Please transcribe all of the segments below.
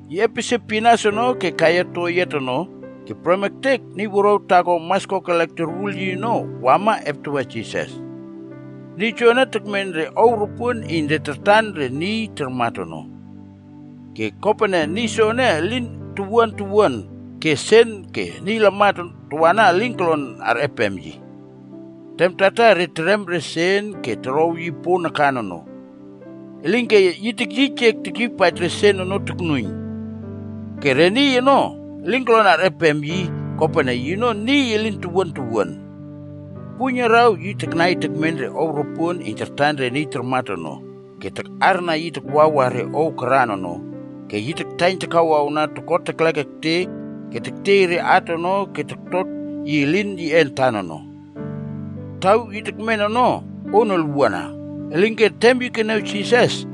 Yi epesie pinas ono ke kaiya toyiat ono ke prem ektek niy wuruaw taako mas kokelek torwul yi ono wama eptawa Jisas. Niy joene tekmen re ow ropuon iyn re tartan re niy tarmat ono. Ke kopene niy soene elin towuan towuan ke sen ke niy lamat tawana elin kolon arꞌepem yi. Tem tartar re terem re sen ke torow yi opon nakan ono. Elinke yi tekyiyjek tekyiypaij re sen ono toknuiyn. Ke re niy ono elin kolon arꞌepem yi kopene yino niy elin towuan towuan. Puiyn araw yi taknai tekmen re ow ropuon iyn tartan re niy tarmat ono ke takꞌarna yi takwawa re ow karan ono ke taktaiyn takawawna toko teklek ektek ke tektiey re at ono ke toktot elin yiꞌe antan ono. Taw yi kemen ono on olwuana. Elinke tem yi keniaw Jisas,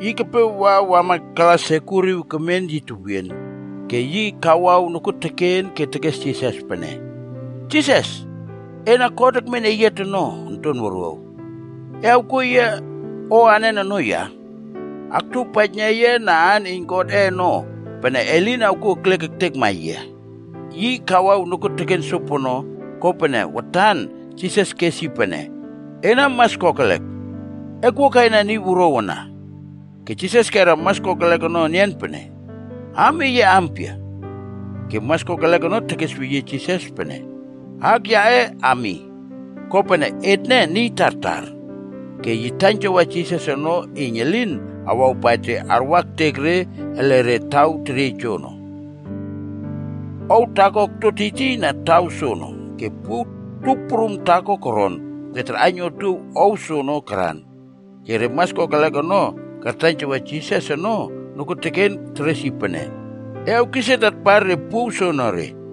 yi kepe wa wama ke kala sekuriw kemen yi tewien. Ke yi kawaw nokuoteken ke tekes Jisas pene, “Jisas, ena God Ekmen Eyiat ono Onton Wuruaw. E awkuo yia o anen ono ya? Aktuowpaijna yia na aan iyn Godꞌe ono, pene e lin awkuo ekliek ektekma yia!” Yi kawaw nokuon sopono, kopene watan Jisas kes yi pene, “Ena mas kokelek. Ekwua kaina niy wuruaw ana.” Ke Jisas kera mas kokelek ono enian pene, “Aam eye ampia?” Ke mas kokelek ono tekesweyie Jisas pene, “Aak yaꞌe Ami. Kopene, etne niy tartar.” Ke yi taiynjawa Jisas ono iyn elin awawpaij re arwa ektek re ele taw teriey joono. Ow taako okto tiytiy na taw soono. Ke puow tup prum taako koron ke tarꞌaiyn otuow ow soono karan. Ke re mas kokelek ono kartaiynjawa Jisas ono nokuoteken teres yi pene, “E awkis et atpar re puow soonore.”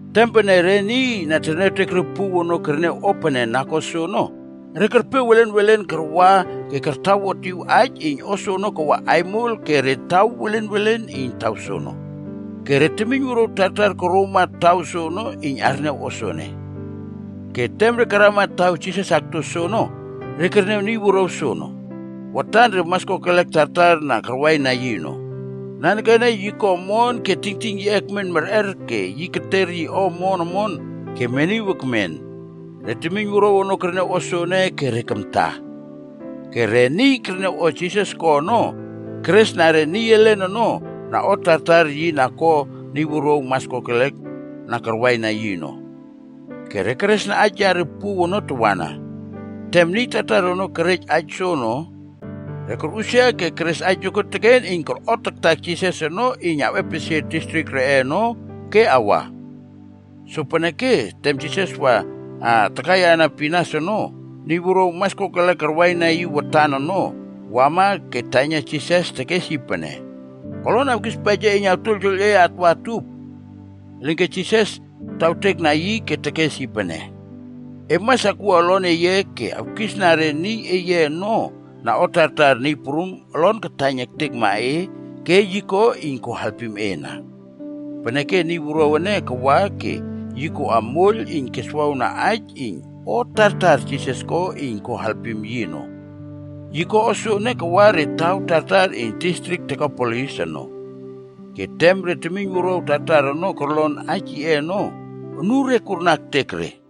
Tem pene re niy na terniawtek re puow ono kerniaw o pene na ko soono, re kerpe welen welen karwa ke kartawotiw aij iyn o soono kawa aimol ke re taw welen welen iyn taw soono. Ke re temiynwuruaw tartar koroma taw soono iyn arniaw o soene. Ke tem re karama taw Jisas akto soono, re kerniaw niy wuruaw soono, watan re mas kokelek tartar na karwaina yi ono. Nanekene yi ko omon ke tingting yiꞌe ekmen merꞌer ke yi keter yi o omon omon ke meniw ekmen. Re temiynwuruaw ono kerniaw o soene ke re kamta. Ke re niy kerniaw o Jisas ko ono, keresna re niy elen ono na o tartar yi na ko niy wuruaw mas kokelek na karwaina yi ono. Ke re keresna aij yare puow ono tawana. Tem niy tartar ono kerej aij soono, re korꞌusia ke keres aij nokuoteken iyn korꞌotaktak Jisas ono iyn awꞌepesie distrik reꞌe ono ke awa. Sopeneke tem Jisas wa takaiyana pinas ono, niy wuruaw mas kokelek karwaina yi watan ono, wama ke taiyna Jisas tekes yi pene, “Kolon awkispaij yia iyn awtuoiyltuoiyl e atwa utup?” Elinke Jisas tawtekna yi ke tekes yi pene, “E mas akwua olon eye ke awkisna re niy eye ono na o tartar Niy Prum olon kataiyn ektekma e ke yi ko iyn ko alpim e ana.” Peneke niy wuruaw ene kawa ke yi koꞌa moiyl iyn yi keswawna aij iyn o tartar Jisas ko iyn ko alpim yi ono. Yi ko o soene kawa re taw tartar iyn distrik Dekapolisa ono. Ke tem re temiyn wuruaw tartar na korlon aij yiꞌe ono, anure kurna ektek re.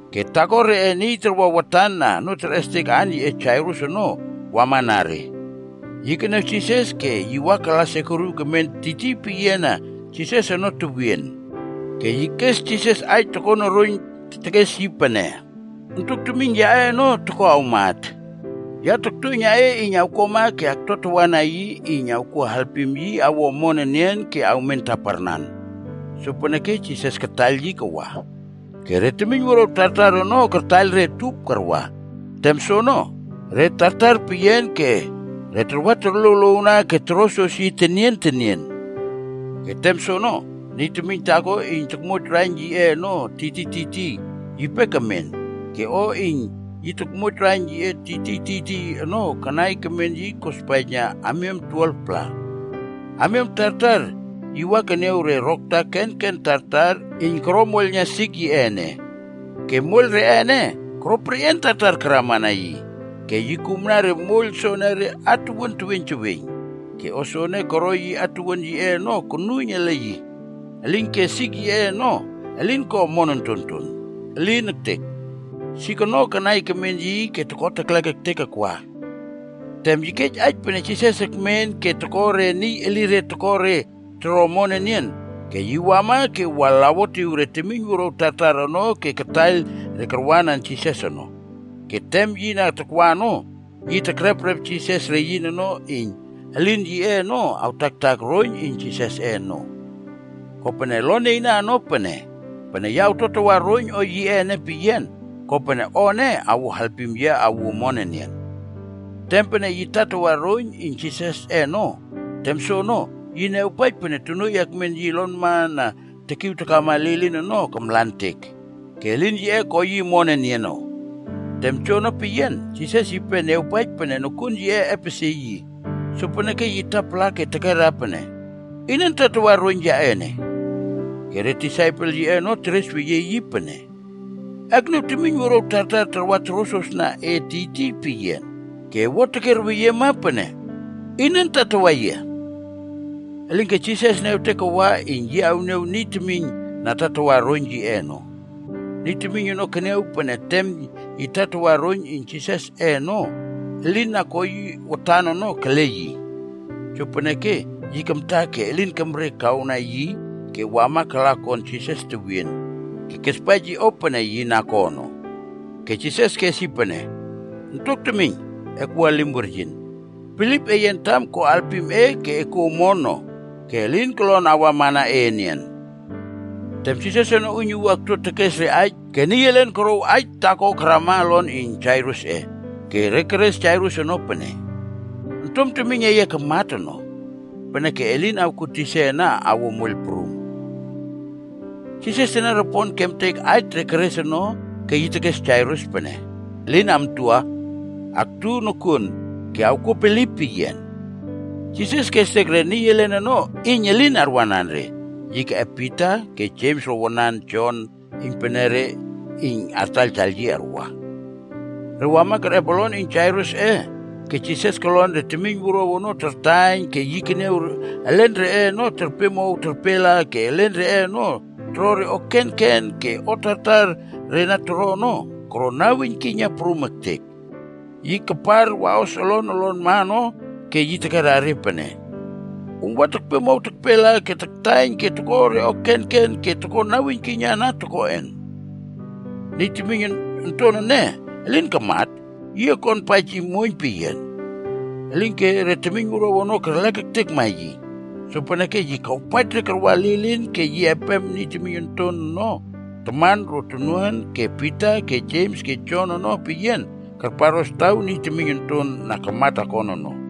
Ke taako reꞌe niy tarwa watan na onoo terꞌestek aan yiꞌe Jairus ono wamana re. Yi keniaw Jisas ke yi wa kala sekuriw kemen tiytiy peyiana Jisas ono tewien. Ke yi kes Jisas aij tokon oroiyn tekes yi pene, “Ontok temiyn yaꞌe ono toko awmat. Ya toktuoiyna e iyn awkuama ke aktuatawana yi iyn awkuo alpim yi awo omon enian ke awmen taparnan.” Sopeneke Jisas kataiyl yi kawa. Ke re temiyn wuruaw tartar ono kartaiyl re utup karwa. Tem soono, re tartar peyian ke re tarwa torluowluowna ke torosros yi tenien tenien. Ke tem soono, niy temiyn taako iyn tokmoij raiyn yiꞌe ono tiytiy tiytiy, yipe kemen. Ke o iyn yi na tokmoij raiyn yiꞌe tiytiy tiytiy ono kanai kemen yi kospaijna amiam 12-pla. Amiam tartar yi wa keniaw re rokta kenken tartar iyn koro moiylna sik yiꞌe ene. Ke moiyl reꞌe ene, koro perꞌian tartar karamana yi. Ke yi kumna re moiyl soonore atuwuan teweiyn teweiyn. Ke o soene koro yi atuwuan yiꞌe ono konuiyn ele yi, elinke sik yiꞌe ono elin ko omon ontonton. Elin ektek! Sik ono kanai kemen yi ke toko teklek ektek akwa. Tem yi kej aij pene Jisas ekmen ke yi toko re niy elire toko re toro omon enian, ke yi wama ke wa laꞌokwotiw re temiyn wuruaw tartar ono ke kataiyl re karwanan Jisas ono. Ke tem yi na takwa ono, yi tekreprep Jisas reyin ono iyn elin yiꞌe ono taktaktak roiyn iyn Jisasꞌe ono. Kopene olon nieyna ono pene, “Pene ya awtuatawa roiyn o yiꞌe ene peyian, kopene o ene awo alpim yia awuo omon enian.” Tem pene yi tatawa roiyn iyn Jisasꞌe ono, tem soono, yi niawpaij pene tonuoiy akmen yi olonma na tekiw takama lilin ono kamlantek, ke elin yiꞌe ko yi omon enian ono. Tem joono peyian, Jisas yipe niawpaij pene nokuon on yiꞌe epesie yi. Sopeneke yi tapala ke tekerna pene, “Inan tatawa roiyn yaꞌe ene?” Ke re disaipel yiꞌe ono teresweyie yi pene, “E akniaw temiyn wuruaw tartar tarwa torosrosna e tiytiy peyian ene. Ke e wua tekierweyiema pene, ‘Inan tatawa yia?’” Elinke Jisas niawtek kawa iyn yi awniaw niy temiyn na tatawa roiyn yiꞌe ono. Niy temiyn ono keniaw pene tem yi tatawa roiyn iyn Jisasꞌe ono ke elin na ko yi watan ono kele yi. Jopeneke, yi kamta ke elin kemre kawna yi ke wama kala kon Jisas tewien, ke kespaij yi o pene yi na ko ono. Ke Jisas kes yi pene, “Ontok temiyn, akwua elim weryin. Bilip eye antam ko alpim e ke ko e kuo omon no ke elin kolon awamana e enian.” Tem Jisas ono uiynuwua okto tekes re aij ke niy elen korouw aij taako karama olon iyn Jairusꞌe. Ke re keres Jairus ono pene, “Ontom temiyn eye kamat ono. Peneke e lin awkuo tisa ana awo moiyl prum.” Jisas teniaropon kemtek aij re keres ono ke yi tekes Jairus pene, “Elin amtua, aktu nokuon ke awkuo bilip peyian.” Jisas kestek re niy elen ono iyn elin arwanan re. Yi keꞌep Pita ke Jems ro wanan, Jon iynpenere iyn re artaiyl yi arwa. Re wama kerꞌep olon iyn Jairusꞌe ke Jisas kolon re temiyn wuruaw ono tartaiyn ke yi keniaw elen reꞌe ono terpemow terpela ke elen reꞌe ono toro re o kenken ke o tartar re na toro ono, koro naweiynkiyna prum ektek. Yi karpar waꞌos olon olonma ono ke yi tekera re pene, “Om wa tekpemow tekpela ke taktaiyn ke toko re o kenken ke toko naweiynkiyna ana tokoꞌen? Niy temiyn onton ene, elin kamat. Yi okonpaij yi muoiyn peyian.” Elinke re temiynwuruaw ono kerlek ektekma yi. Sopeneke yi kawpaij re karwa lilin ke yi epem niy temiyn onton ono taman ro tonuan ke Pita ke Jems ke Jon ono peyian karparꞌos taw niy temiyn onton na kamat akon ono.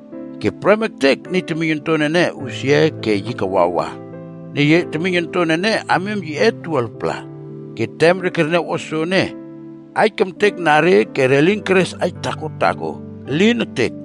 Ke prem ektek niy temiyn onton ene usia ke yi kawawa. (Niy temiyn ene amiam yiꞌe 12-pla.) Ke tem re kerniaw o soene, aij kemtekna re ke re lin keres aij taako taako, elin ektek!